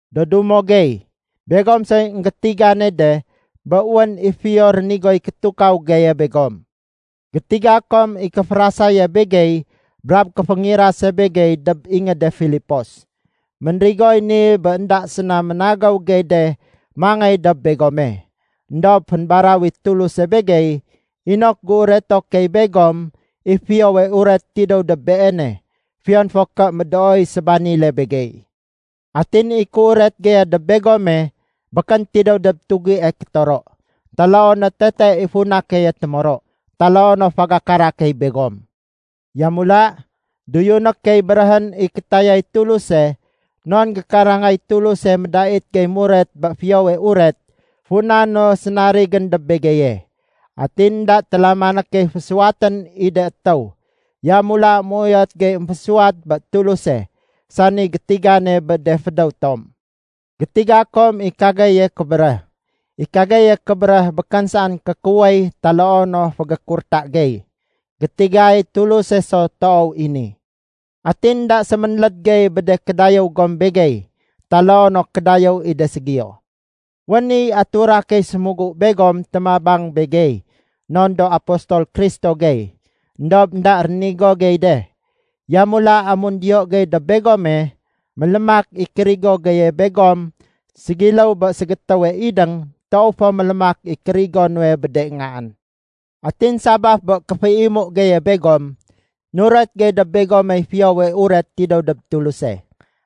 Do dumo gey, begom soy énggétigane de bé wén i fiyo rénigoy kétukaw geye begom. Gétiga kom i kéférasaye begey brab kéféngirase begey dob ingéde Filipos. Ménrigoy ni bé énda séna ménagéw gey de mangéy dob begome. Endob fénbaraw i Tuluse begey inok géureto key begom i Fiyowe Uret tidéw dob Beene, fiyon fo ké médooy sébanile begey. Atin i kéuret geye dob begome békén tidéw dob tugie kétoro, taloo no tete i funa keye témoro, taloo no fagakara key begom. Yamula, doyuné key béréhén i kétayay Tuluse, non gékarangay Tuluse médait gey muret bé Fiyowe Uret funa no sénarigén dob begeye. Atin énda télamané key fésuwatén i de étéw, yamula méuyot gey émfésuwat bé Tuluse sani gétigane bé de fédéw tom. Gétiga kom i kageye kébéréh. I kageye kébéréh békén saén kékuwéy taloo no fégékurta gey. Gétigay Tuluse so toow i ni. Atin énda séménléd gey bé de kédayéw gom begey taloo no kédayéw i de ségiyo. Wén i atura key sémugu begom témabang begey non do apostol Kristo gey, éndob énda rénigo gey de. Yamula amun diyo gey dob begome, mélémak i kérigo geye begom ségiléw bé ségétéwe idéng toow fo mélémak i kérigo nuwe bé de ngaén. Atin sabaf bé kéféimu geye begom, nuret gey dob begomey Fiyowe Uret tidéw dob Tuluse.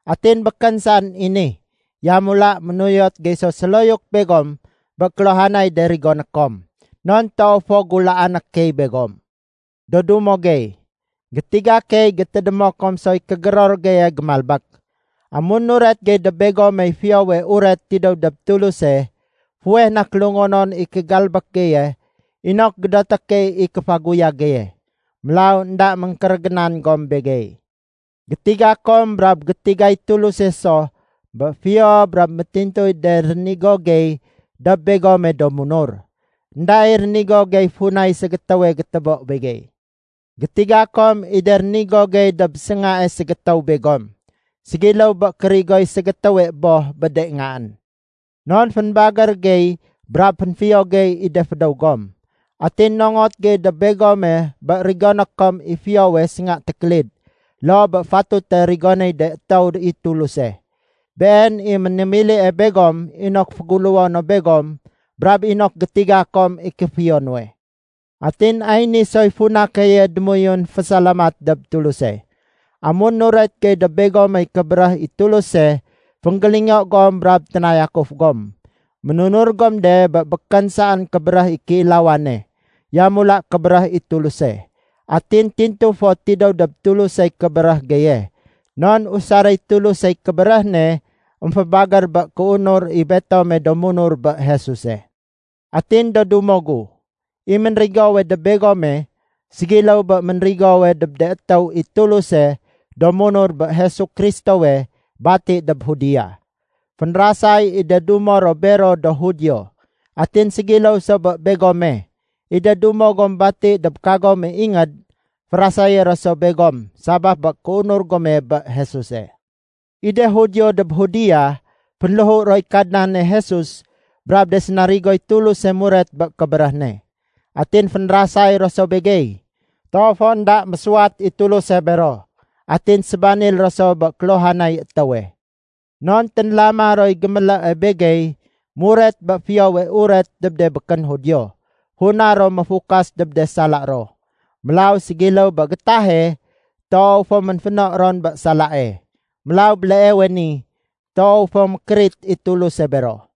Atin békén saén i ni, yamula ménuyot gey so séloyuk begom bé kéluhanay de rigoné kom, non toow fo gulaané key begom. Do dumo gey, gétiga key gétédémo kom soy kégéror geye gémalbék. Amun nuret gey dob begomey Fiyowe Uret tidéw dob Tuluse, fuweh na kélungonon i kégalbék geye inok gédoté key i kéfaguyag geye. Mélaw énda méngkérégénan gom begey. Gétiga kom brab gétigay Tuluse so bé fiyo brab métintuy de rénigo gey dob begome do munur. Enda i rénigo gey funay ségétéwe gétébo begey. Gétiga kom i de rénigo gey dob séngae ségétéw begom, ségiléw bé kérigoy ségétéwe boh bé de ngaén. Non fénbagér gey brab fénfiyo gey i de fédéw gom. Atin nongot gey dob begome bé rigoné kom i fiyowe sénga tékélid loo bé fatute rigonéy de étéw i Tuluse. Been i ménémilie begom inok féguléwo no begom brab inok gétiga kom i kéfiyo nuwe. Atin ay ni soy funa keye démoyun fésalamat dob Tuluse. Amun nuret gey dob begomey kébéréh i Tuluse, fénggélingo gom brab ténayakuf gom. Ménunur gom de bé békén saén kébéréh i kéilawane, yamula kébéréh i Tuluse. Atin tintu fo tidéw dob Tulusey kébéréh geye, non usaréy Tulusey kébéréh ne émfébagér bé kéunur i betome do munur bé Jesuse. Atin do dumo gu, i ménrigowe dob begome ségiléw bé ménrigowe dob de étéw i Tuluse do munur bé Jesu Kristowe bati dob Judea. Fénrasay i de dumo ro bero do Judio. Atin ségiléw so bé begome, i de dumo gom bati dob kagome ingéd férasayé ro so begom sabaf bé kéunur gome bé Jesuse. I de Judio dob Judea fénléhu roy Kadnane Jesus brab de sénarigoy Tuluse muret bé kébéréh ne. Atin fénrasay ro so begey. Toow fo énda mésuwat i Tuluse bero. Atin sébanil ro so bé kéluhanay étéwe. Non ténlama roy gémélée begey muret bé Fiyowe Uret dob de békén Judio, funa ro méfukas dob de sala ro. Mélaw ségiléw bé gétahe, toow fo ménféno ron bé salae. Mélaw béleewe ni, toow fo mékérit i Tuluse bero.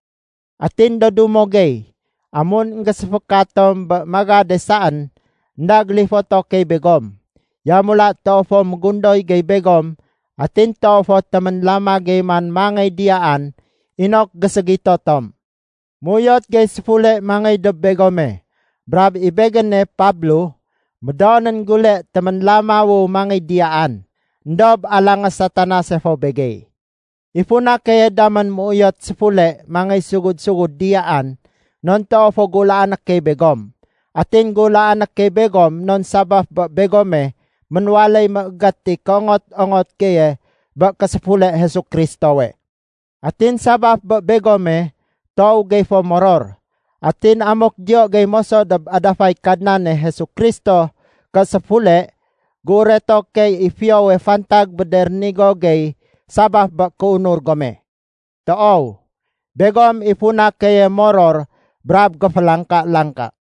Atin do dumo gey, amun énggéséféka tom bé magade saén énda gélifoto key begom. Yamula toow fo mégundoy gey begom atin toow fo téménlama gey man mangéy diyaan inok géségito tom. Méuyot gey séfule mangéy dob begome. Brab i begéne, Pablo, médoonén gule téménlamawu mangéy diyaan. Endob alangé Satanase fo begey. I funa keye damén méuyot séfule mangéy sugud-sugud diyaan, non toow fo gulaané key begom. Atin gulaané key begom non sabaf bé begome, ménwaléy méégét i kéongot-ongot geye bé késéfule Jesu Kristowe. Atin sabaf bé begome, toow gey fo moror. Atin amuk diyo gey moso dob adafay Kadnane Jesu Kristo ké séfule, géureto key i fiyowe fantag bé de rénigo gey sabaf bé kéunur gome. Toow, begom i funa keye moror brab géfélangka-langka.